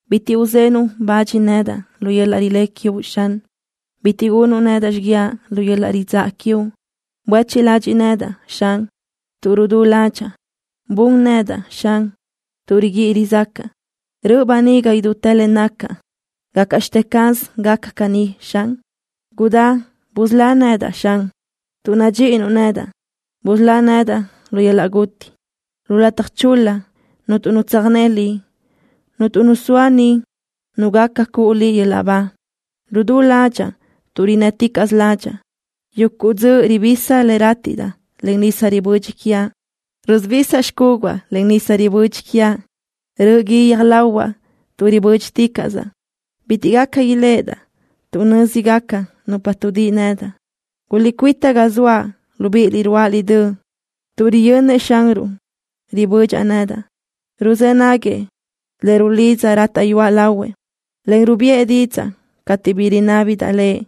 Bitiʼ uzenuʼ bach nedaʼ lu yöl-laʼ rilé quiuʼ, Xan. Bitiʼ gunuʼ nedaʼ xiguiaʼ lu yöl-laʼ ridzáʼa quiuʼ. Buéchiʼ ladxiʼ nedaʼ, Xan, tuʼ rudú ládxaʼa. Bun nedaʼ, Xan, tuʼ riguíʼi rizácaʼa. Röʼö böniga idútë le nacaʼ. ¿Gácaʼxte caz gaca caní, Xan? Gudá dusölóʼ nedaʼ, Xan. Tuʼ nadxíʼinuʼ nedaʼ, busölá nedaʼ lu yöl-laʼ guti. Lu lataj chul-la cuntu nu tsöjné Liʼ. Cuntu nu zoa niʼ nu gaca cuʼu Liʼ yöl-laʼ ba. Rudú ládxaʼa tuʼ rinnë́ticaʼsö ládxaʼa. Yuguʼ dzöʼ ribisa le rátiʼdaʼ len nisa ribödxi quiaʼ. Rusubisaʼ xcúguaʼ len nisa ribödxi quiaʼ. Röʼö gui guiö́j lahuaʼ tuʼ ribö́dxiticaʼsaʼ. Bitiʼ gaca iléʼedaʼ tuʼ nö́zigaca nupa tuʼdíʼi nedaʼ. Guliʼcuíta ga zoaʼ, libíʼiliʼ, ruáʼaliʼ döʼ, tuʼ riyönnëʼ Xanruʼ ribödxaʼ nedaʼ. Ruzë́ naguëʼ le rulidzaʼ, rátaʼyuaʼ lahuëʼ, en rubiʼë didzaʼ cateʼ bi rinábidaʼ Lëʼ.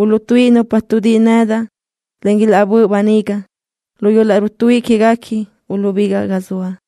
Uluʼtuíʼi nupa tuʼdíʼi nedaʼ, en ilaʼbö́ʼ böniga. Lu yöl-laʼ rutuíʼi quéguequi uluʼbigaʼ ga zoaʼ.